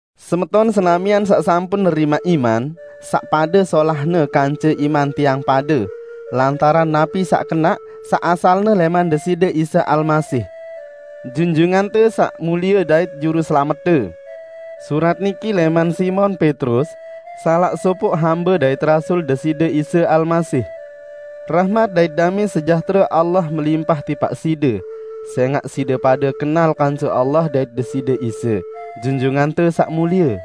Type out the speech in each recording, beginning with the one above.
Semeton senamian saq sampun nerimaq iman saq pade solahne kance iman tiang pade, lantaran napi saq kenaq, saq asalne lẽman Deside Isa Almasih, Junjungante Saq Mulie dait Juruselamette. Surat niki lẽman Simon Petrus, salaq sopoq hambe dait rasul Deside Isa Almasih. Rahmat dait damẽ sejahtere Allah melimpah tipaq side, sẽngaq side pade kenal kance Allah dait Deside Isa, Junjungante Saq Mulie.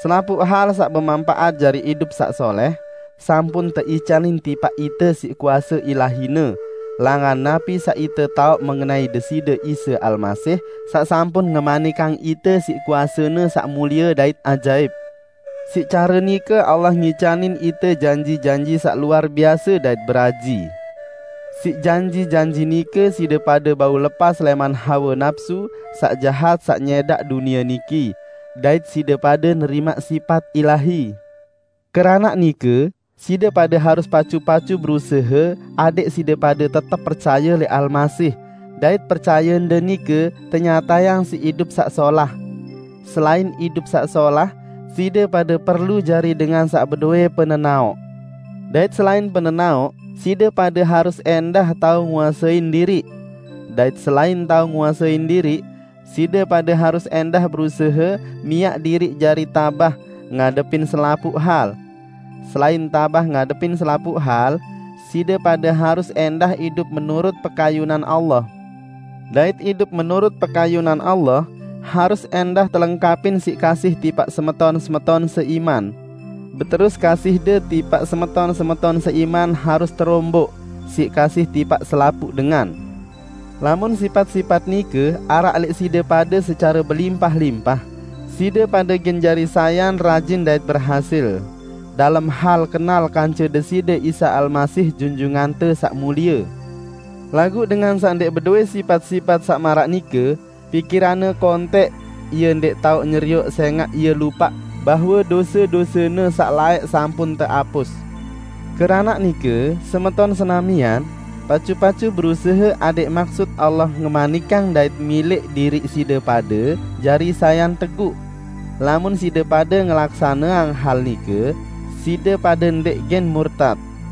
Selapuq hal saq bemanpaat jari idup saq solẽh sampun teicanin tipaq ite siq kuase Ilahi-Ne, langan napi saq ite taoq mengenai Deside Isa Almasih saq sampun ngemanikang ite siq kuase-Ne saq mulie dait ajaip. Siq care nike Allah ngicanin ite janji-janji saq luar biase dait beraji. Siq janji-janji nike side pade bau lepas lẽman hawe napsu saq jahat saq nyẽdaq dunie niki, dait side pade nerimaq sipat ilahi. Keranaq nike, side pade harus pacu-pacu berusahe adẽq side pade tetep percaye lẽq Almasih dait percayende nike tenyatayang siq idup saq solah. Selain idup saq solah, side pade perlu jari dengan saq bedowẽ penenaoq, dait selain penenaoq, side pade harus ẽndah tao nguasein diriq. Dait selain tao nguasein diriq, side pade harus ẽndah berusahe miaq diriq jari tabah ngadepin selapuq hal. Selain tabah ngadepin selapuq hal, side pade harus ẽndah idup menurut pekayunan Allah. Dait idup menurut pekayunan Allah harus ẽndah telengkapin siq kasih tipaq semeton-semeton seiman. Beterus kasihde tipaq semeton-semeton seiman harus teromboq siq kasih tipaq selapuq dengan. Lamun sipat-sipat nike araq lẽq side pade secare belimpah-limpah, side pade gen jari sayan rajin dait berhasil, dalem hal kenal kance Deside Isa Almasih Junjungante Saq Mulie. Laguq dengan saq ndẽq bedowẽ sipat-sipat saq maraq nike, pikiranne kontẽq, ie ndẽq tao nyerioq sẽngaq ie lupaq bahwe dose-dosene saq laẽq sampun teapus. Keranaq nike, semeton senamian, pacu-pacu berusahe adẽq maksut Allah ngemanikang dait milẽq diriq side pade jari sayan teguq. Lamun side pade ngelaksaneang hal nike, side pade ndẽq gen murtat.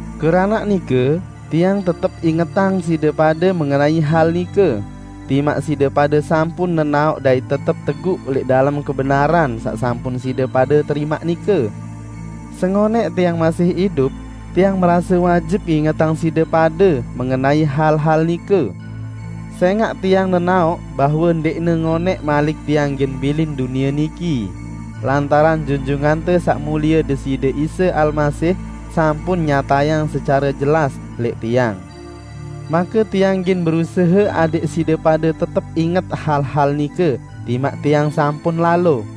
Keranaq nike, tiang tetep ingetang side pade mengenai hal nike, timaq side pade sampun nenaoq dait tetep teguq lẽq dalem kebenaran saq sampun side pade terimaq nike. Sengonẽq tiang masih idup, tiang merase wajib ngingetang side pade mengenai hal-hal nike. Sẽngaq tiang nenaoq bahwe ndẽqne ngonẽq malik tiang gen bilin dunie niki, lantaran Junjungante Saq Mulie Deside Isa Almasih sampun nyatayang secare jelas lẽq tiang. Make tiang gen berusahe adẽq side pade tetep inget hal-hal nike timaq tiang sampun lalo.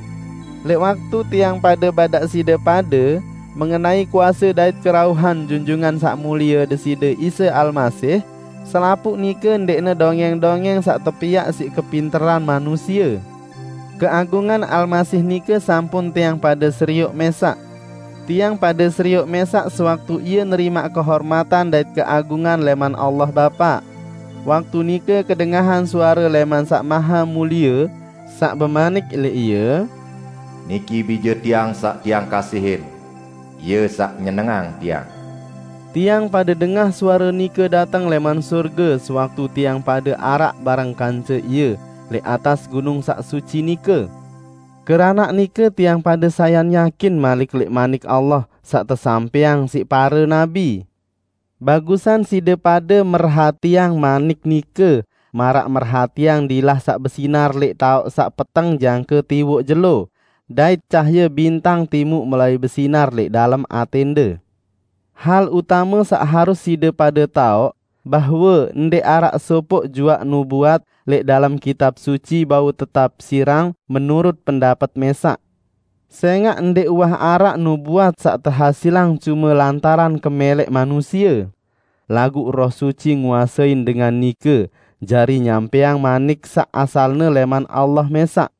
Lẽq waktu tiang pade badaq side pade mengenai kuase dait kerauhan Junjungan Saq Mulie Deside Isa Almasih. Selapuq nike ndẽqne dongẽng-dongẽng saq tepiaq siq kepinteran manusie. Keagungan Almasih nike sampun tiang pade serioq mẽsaq. Tiang pade serioq mẽsaq sewaktu Ie nerimaq kehormatan dait keagungan lẽman Allah Bapa. Waktu nike kedengahan suare lẽman Saq Mahemulie, saq bemanik lẽq Ie, "Niki Bije Tiang saq Tiang kasihin. Ie saq nyenengang Tiang." Tiang pade dengah suare nike dateng lẽman sorge sewaktu tiang pade araq bareng kance Ie lẽq atas gunung saq suci nike. Keranaq nike tiang pade sayan yakin malik lẽq Manik Allah saq tesampẽang siq pare nabi. Bagusan side pade merhatiang manik nike maraq merhatiang dilah saq besinar lẽq taoq saq peteng jangke tiwoq jelo, dait cahaye bintang timuq mulai besinar lẽq dalem atẽnde. Hal utame saq harus side pade taoq: Bahwe ndẽq araq sopoq juaq nubuat lẽq dalem Kitab Suci bau tetapsirang menurut pendapet mẽsaq. Sẽngaq ndẽq uwah araq nubuat saq tehasilang cume lantaran kemẽlẽq manusie. Laguq Roh Suci nguasein dengan nike jari nyampẽang manik saq asalne lẽman Allah mẽsaq.